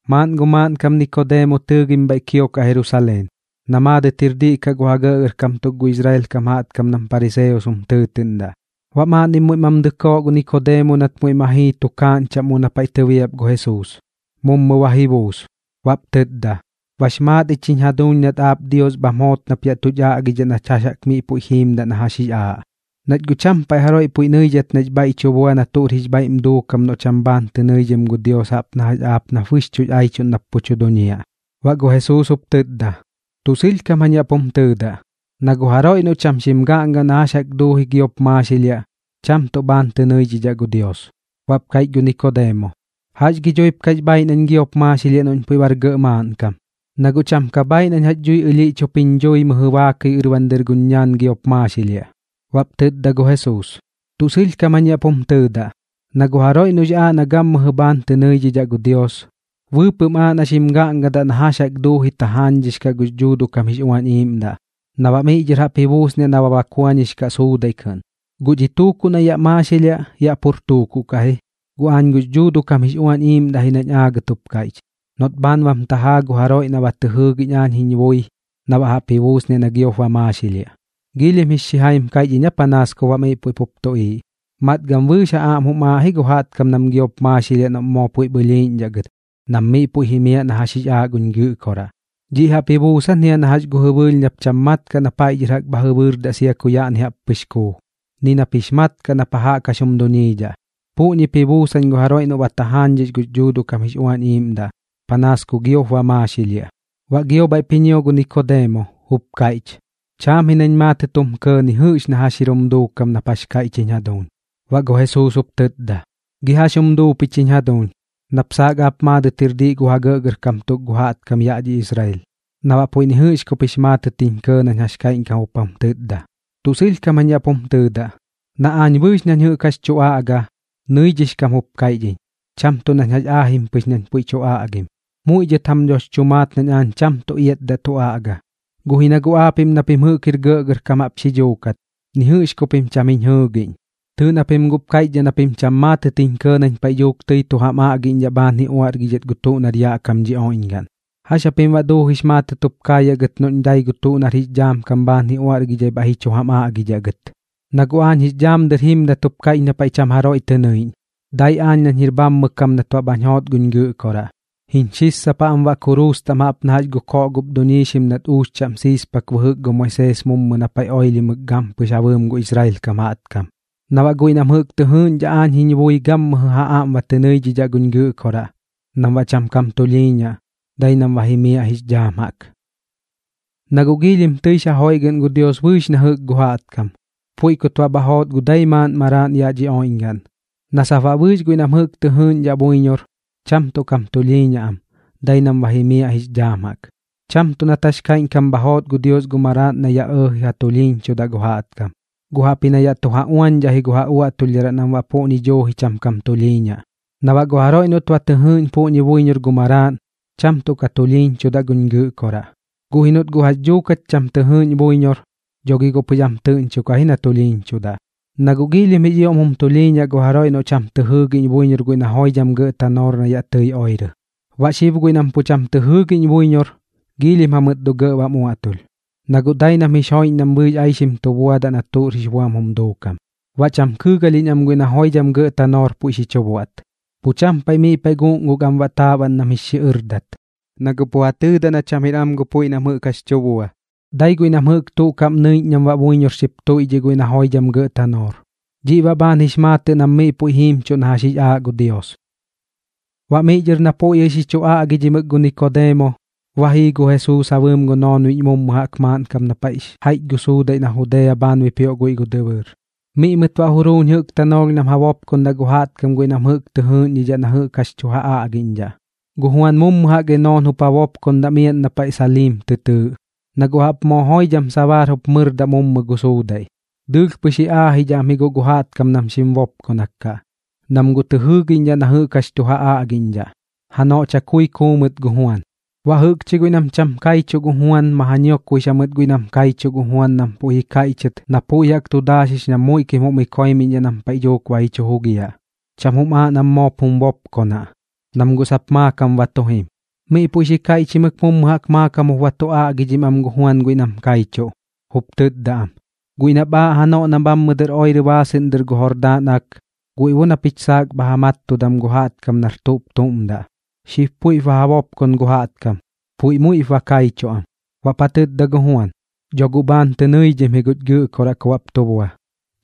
Maaꞌn gu maaꞌnkam Nikodeemo tɨɨgim bhaiꞌ kiokaꞌ Jerusaleen, na maadɨt jir diꞌ kaꞌ gu ja gɇꞌgɇrkam tuk gu Israel kam jaꞌtkam nam pariseos jum tɨɨtɨꞌndaꞌ. Baꞌ maaꞌnnim muiꞌ mam dɨkoo gu Nikodeemo nat muiꞌ ma jii tukaaꞌñ chaꞌm mu na paiꞌ tɨbiap gu Jesuus. Mummu ba ji buus, baꞌp tɨtda: ―Bax maat ich jiñ jaduuñ nat aap Dios bham joot nap yaꞌ tuch aꞌgidhaꞌ nach jax jaꞌk miꞌ puiꞌ jiimdaꞌ na jax jix aaꞌ, nach guꞌ cham paiꞌ jaroiꞌ puiꞌ nɨidhat nax bhaiꞌ tu bua na tuꞌr jix bhaiꞌm duukam noꞌ cham bhaan tɨ nɨidhim gu Dios jaꞌp na jax aap nap bɨxchuꞌx aichuꞌn nap pu tu duñiaꞌ. Baꞌ gu Jesuus jup tɨtda: ―Tuꞌ sɨlhkam jañ yaꞌ pum tɨɨdaꞌ, na gu jaroiꞌ noꞌ cham xim gaꞌnga na jax jaꞌk duuji giop maaxilhiaꞌ, cham tuꞌ bhaan tɨ nɨidhidhaꞌ gu Dios. Baꞌp kaiꞌch gu Nikodeemo: ―¿Jax gi dhuip kax bhaaiꞌ nañ giop maaxilhiaꞌ noꞌñ puiꞌ bar gɇꞌ maaꞌnkam? Na guꞌ cham ka bhaaiꞌ nañ jax dhui ɨlhiꞌch jup jiñ dhui mɨjɨ baakɨi ɨrban guñ ñaan giop maaxilhiaꞌ. Baꞌp tɨtda gu Jesuus: ―Tuꞌ sɨlhkam jañ yaꞌ pum tɨɨdaꞌ, na gu jaroiꞌ noꞌx aaꞌ na gammɨjɨ bhaan tɨ nɨidhidhaꞌ gu Dios, bɨɨpɨꞌm aaꞌ na xim gaꞌngadaꞌ na jax jaꞌk duuji tajaañdhix kaꞌ gux Dhuuduꞌ kam jix Uañ Iiꞌmdaꞌ, na baꞌ miꞌ dhɨr jaꞌp ji buusniaꞌ na ba bakuañix kaꞌ suudaiꞌ kɨꞌn. Guꞌ dhi tuukuꞌ na yaꞌ maaxilhiaꞌ, yaꞌ pur tuukuꞌ kaꞌ ji. Guꞌ aañ gux Dhuuduꞌ kam jix Uañ Iiꞌmdaꞌ ji nañ aagɨt jup kaiꞌch, noꞌt bhaan bam tajaa gu jaroiꞌ noꞌ ba tɨ jɨɨgiꞌñ aañ jiñ bui na jaꞌp ji buusniaꞌ na giop ba maaxilhiaꞌ. ¿Giilhim jix xijaim kaiꞌch iñ aa panaas kup baꞌ miꞌ puiꞌ pup tuꞌiiꞌ? Matgam bɨɨx ja aꞌm jum aaꞌ ji gu jaꞌtkam nam giop maaxilhiaꞌ noꞌm moo puiꞌp ɨlhiiꞌñdhaꞌ gɨt nam miꞌ puiꞌ ba jimiaꞌ na jax jix aaꞌ guñ Gɨꞌkoraꞌ. Dhiꞌ jaꞌp ji buusan jia na jax gu jɨbɨɨlh nap pu cham mat kaꞌ na paiꞌ dhɨr bha jɨbɨɨrdaꞌ sia ku yaꞌni jaꞌp pɨx kuu, ni nap jix mat kaꞌ na pa jaꞌk jax jum duñiidhaꞌ. Puꞌñip ji buusan gu jaroiꞌ noꞌ ba tajaañdhix gux Dhuuduꞌ kam jix Uañ Iiꞌmdaꞌ, panaas ku giop ba maaxilhiaꞌ. Baꞌ gio bhaiꞌp ji ñio gu Nikodeemo, jup kaiꞌch: ―Chaam ji nañ maatɨt jum kɇɇ ni jɨꞌx na jax jir jum duukam nap jax kaiꞌch jiñ jaduuñ. Baꞌ gu Jesuus jup tɨtda: ―¿Gi jax jum duu pich jiñ jaduuñ? Nap saak aap maadɨt jir diꞌ gu ja gɇꞌgɇrkam tuk gu jaꞌtkam yaꞌ dhi Israel, na baꞌ puiꞌ ni jɨꞌx kup jix maatɨt jiñ kɇɇ nañ jax kaiꞌñkam jup jum tɨtda. Tuꞌ sɨlhkam jañ yaꞌ pum tɨɨdaꞌ, na aañ bɨɨx nañ jɨꞌk jax tu aꞌga, nɨidhix kam jup kaiꞌch iñ, cham tuꞌ nañ jax aajim pɨx nañ puiꞌ tu aꞌgim. Muiꞌ dhɨt jam dhox chu maat nañ aañ cham tuꞌ iatdaꞌ tu aꞌga, guꞌ ji na guꞌ aapiꞌm na pim jɨꞌk jir gɇꞌgɇrkam jaꞌp xi dhuukat, ni jɨꞌx ku pim cham jiñ jɨɨgiꞌñ. Tɨɨꞌ na pim guꞌp kaiꞌchdhaꞌ na pim cham maatɨt jiñ kɇɇ nañ paiꞌ dhuuk tɨi tu jam aꞌgiꞌñdhaꞌ bhaan ji uaꞌrgidhat gu tuꞌ nar yaꞌ kam dhi oiꞌñgaꞌn. ¿Jax japim baꞌ duujix maatɨt jup kaayaꞌ gɨt noꞌñ dai gu tuꞌ nar jix dhaam kam bhaan ji uaꞌrgidhai bhaiꞌ ji chu jam aꞌgidhaꞌ gɨt? ’Na guꞌ aañ jix dhaam dɨr jimdat jup kaiꞌch na paiꞌ cham jaroiꞌ tɨ nɨiꞌñ, dai aañ nañ jir bhammɨ kam nat baꞌ bhañ joot guñ Gɨꞌkoraꞌ. Jiñ xissapaꞌ am baꞌ kuruus taꞌm jaꞌp na jax gu koꞌ gup duñiixim nat uux chaꞌm sissapak bɨjɨk gu Moisees mummu na paiꞌ oilhimɨk gampɨx ja bɨɨm gu Israel kam jaꞌtkam. Na baꞌ guiꞌ nam jɨꞌk tɨ jɨɨgiꞌñdhaꞌ aañ jiñ bui gammɨjɨ ja aꞌm ba tɨ nɨidhidhaꞌ guñ Gɨꞌkoraꞌ, nam baꞌ cham kam tulhiiñaꞌ, dai nam ba jimiaꞌ jix dhaam jaꞌk. Na guꞌ giilhim tɨix ja joiꞌgɨꞌn gu Dios bɨɨx na jɨꞌk gu jaꞌtkam, puiꞌ kut baꞌ bha joot gu dai maaꞌn maraaꞌn yaꞌ dhi oiꞌñgaꞌn, na sap baꞌ bɨɨx guiꞌ nam jɨꞌk tɨ jɨɨꞌñdhaꞌ buiñor, cham tuꞌ kam tulhiiñaꞌ am, dai nam ba jimiaꞌ jix dhaam jaꞌk. Cham tuꞌ nat jax kaiꞌñkam bha joot gu Dios gu maraaꞌn na yaꞌ ɇɇji ja tulhiiñchudaꞌ gu jaꞌtkam, guꞌ jaꞌpji na yaꞌ tu ja uañdhaꞌ ji gu ja uaꞌtulhdharaꞌ nam baꞌ puꞌñi duuji cham kam tulhiiñaꞌ. Na baꞌ gu jaroiꞌ noꞌt ba tɨ jɨɨꞌn puꞌñi buiñor gu Maraaꞌn, cham tuꞌ ka tulhiiñchudaꞌ guch Gɨꞌkoraꞌ. Guꞌ ji noꞌt guꞌ jax dhuuk cham tɨ jɨɨꞌñ buiñor, dho gi guꞌ pɨx am tɨꞌñchokaꞌ ji na tulhiiñchudaꞌ. Na guꞌ giilhim jix ioꞌm jum tulhiiñaꞌ gu jaroiꞌ noꞌ cham tɨ jɨɨgiꞌñ buiñor guiꞌ na joidham gɇꞌ tanoor na yaꞌ tɨi oirɨ. Baꞌ xib guiꞌ nam pu cham tɨ jɨɨgiꞌñ buiñor, giilhim jamɨt dho gɇꞌ bam uaꞌtulh, na guꞌ dai nam jix joiꞌñ nam bɨɨx aixim tu bua na tuꞌr jix buam jum duukam. Baꞌ cham kɨɨgalhiꞌñ am guiꞌ na joidham gɇꞌ tanoor puiꞌ xi chu buaꞌt. Pu cham paiꞌ miꞌ paiꞌ guꞌnguk am baꞌ taaꞌban nam jix xiꞌɨrdat, na guꞌ pu ja tɨɨdaꞌ na cham jir am gu puiꞌ nam jɨꞌk jax tu bua. Dai guiꞌ nam jɨꞌk tuꞌ kaꞌm nɨiꞌñ nam baꞌ buiñor xip tuiꞌdhiꞌ guiꞌ na joidham gɇꞌ tanoor. Dhiꞌ baꞌ bhaan jix maatɨꞌ nam miꞌ puiꞌ jiimchuꞌ na jax jix aaꞌ gu Dios. Baꞌ miꞌ dhɨr na puiꞌ jɨꞌ xi chu aꞌgidhimɨk gu Nikodeemo, ba jii gu Jesuus ja bɨɨm gu noonbiꞌñ mummu jaꞌk maaꞌn kap na paiꞌx jaiꞌch gu suudaiꞌ na Judea bhaan bipioꞌ guiꞌ gu dɨbɨɨr. Miꞌ mɨt baꞌ juruuñ jɨꞌk tanoolh nam ja bopkondaꞌ gu jaꞌtkam guiꞌ nam jɨꞌk tɨ jɨɨꞌñdhidhaꞌ na jɨꞌk jax tu ja aꞌgiꞌñdhaꞌ. Gu Juan mummu jaꞌk Enoon jup ja bopkondaꞌ miaꞌn na paiꞌ Salim tɨ tɨɨꞌ, na guꞌ jaꞌp moo joidham sabaar jup mɨrdaꞌ mummu gu suudaiꞌ. Dɨɨlh pɨx ji aajidhaꞌ am ji guꞌ gu jaꞌtkam nam xim bopkonak kaꞌ, nam guꞌ tɨ jɨɨgiꞌñdhaꞌ na jɨꞌk jax tu ja aꞌgiꞌñdhaꞌ. Janoꞌ chakui kuu mɨt gu Juan. Baꞌ jɨꞌkchi guiꞌ nam cham kaichuꞌ gu Juan ma ja ñiokbuix jamɨt guiꞌ nam kaichuꞌ gu Juan nam puiꞌ ji kaiꞌchɨt na puiꞌ jaꞌk tu daaxix nam muiꞌkim jum ikoimiꞌñ nam paiꞌ dhuuk ba ji chu jugiaꞌ. Cham jum aaꞌ nam moop jum bopkonaꞌ, nam guꞌ sap maakam tu jim. Miꞌ puiꞌ xi kaiꞌchimɨk mummu jaꞌk maakam jup ba tu aꞌgidhim am gu Juan guiꞌ nam kaichuꞌ, jup tɨtda am: ―Guiꞌ nap aaꞌ janoꞌ na bhammɨ dɨr oirɨ baasɨꞌn dɨr gu Jordaan Ak, guiꞌ bo na pich saak bha ja mattudam gu jaꞌtkam nar tuꞌp tuꞌm daꞌ, xib puiꞌp ba ja bopkon gu jaꞌtkam. Puiꞌ muiꞌp ba kaichuꞌ am. Baꞌp ja tɨtda gu Juan: ―Dho guꞌ bhaan tɨ nɨidhim ji guch Gɨꞌkoraꞌ ku baꞌp tu bua,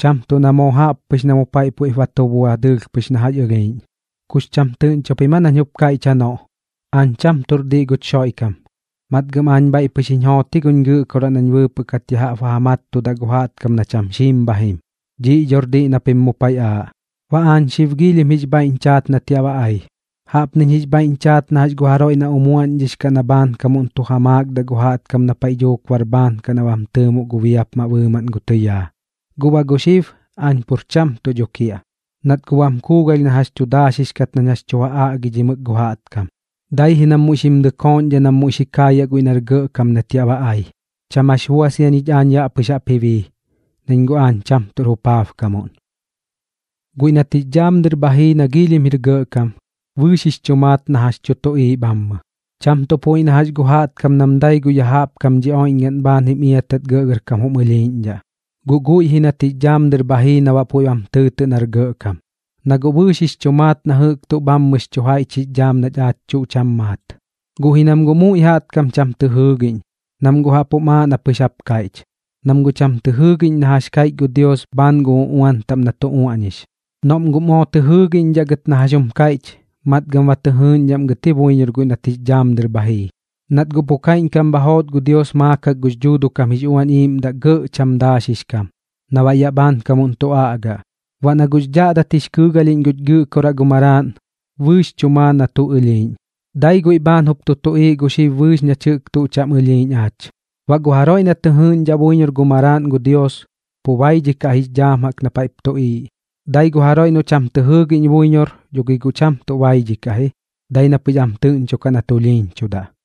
cham tuꞌ na moo jaꞌp pɨx na mu paiꞌ puiꞌp ba tu bua dɨɨlh pɨx na jax ɨlhiiꞌñ. ¿Kux cham tɨꞌñcho pim aa nañ jup kaiꞌch janoꞌ: Aañ cham tuꞌr diꞌ guch Xoiꞌkam? Matgam aañ bhaiꞌ pɨx jiñ joot ji guch Gɨꞌkoraꞌ nañ bɨɨpɨꞌ kat ya jaꞌp ba ja mattudaꞌ gu jaꞌtkam na cham xiim bha jim. Dhiꞌ dhor diꞌ na pim mu paiꞌ aaꞌ. Baꞌ aañ xib giilhim jix bhaiꞌñ chaat nat yaꞌ ba ai. Jaꞌpniñ jix bhaiꞌñ chaat na jax gu jaroiꞌ na umuaꞌñdhix kaꞌ na bhaankamuꞌn tu ja maakdaꞌ gu jaꞌtkam na paiꞌ dhuuk bar bhaan kaꞌ na bam tɨɨmoꞌ gu biapmaꞌ bɨɨmaꞌn gu tɨyaa. Guꞌ baꞌ gu xib aañ pur cham tuꞌ dho kiaꞌ, nat guꞌ bam kuugalh na jax tu daaxix kat nañ jax tu ja aꞌgidhimɨk gu jaꞌtkam. Dai ji nam muiꞌ xim dɨkooꞌñdhaꞌ nam muiꞌ xi kaayaꞌ guiꞌ nar gɇꞌkam nat yaꞌ ba ai. Cham jax bua sia ñich aañ yaꞌ pɨx jaꞌp ji bii, nañ guꞌ aañ cham tuꞌr jupaabkamuꞌn. Guiꞌ nat jix dhaam dɨr bha jii na giilhim jir gɇꞌkam, bɨɨx jix chu maat na jax tu tuꞌiiꞌ bhammɨ. Cham tuꞌ puiꞌ na jax gu jaꞌtkam nam dai gu tuꞌ ya jaꞌp kam dhi oiꞌñgaꞌn bhaan jim iatat gɇꞌgɇrkam jum ɨlhiiꞌñdhaꞌ, guꞌ guiꞌ ji nat jix dhaam dɨr bha jii na baꞌ puiꞌm tɨɨtɨꞌ nar gɇꞌkam. Na guꞌ bɨɨx jix chu maat na jɨꞌk tuꞌ bhammɨx chu jaiꞌch jix dhaam nach aach tuꞌ cham maat. Guꞌ ji nam guꞌ muiꞌ jaꞌtkam cham tɨ jɨɨgiꞌñ, nam guꞌ jaꞌp jum aaꞌ na pɨx jap kaiꞌch, nam guꞌ cham tɨ jɨɨgiꞌñ na jax kaiꞌch gu Dios bhaan gu uꞌuan taꞌm na tu uaꞌñix. Noꞌm guꞌ moo tɨ jɨɨgiꞌñdhaꞌ gɨt na jax jum kaiꞌch, matgam ba tɨ jɨɨꞌñdhaꞌm gɨt ji buiñor guiꞌ nat jix dhaam dɨr bha jii. Nat guꞌ pu kaiꞌñkam bha joot gu Dios maakak gux Dhuuduꞌ kam jix Uañ Iiꞌmdaꞌ gɇꞌ cham daaxix kam, na baꞌ yaꞌ bhaankamuꞌn tu aꞌgaꞌ. Baꞌ na guꞌx dhaꞌdat jix kɨɨgalhiꞌñ guch Gɨꞌkoraꞌ gu Maraaꞌn, bɨɨx chu maa na tuꞌ ɨlhiiꞌñ. Dai guiꞌ bhaan jup tu tuꞌiiꞌ gu xib bɨɨx nach jɨꞌk tuꞌ cham ɨlhiiꞌñ aach. Baꞌ gu jaroiꞌ na tɨ jɨɨꞌñdhaꞌ buiñor gu Maraaꞌn gu Dios, pu baidhikaꞌ jix dhaam jaꞌk na paiꞌp tuꞌiiꞌ. Dai gu jaroiꞌ noꞌ cham tɨ jɨɨgiꞌñ buiñor dho gi guꞌ cham tuꞌ baidhikaꞌ ji, dai na pɨx am tɨꞌñchokaꞌ na tulhiiñchudaꞌ.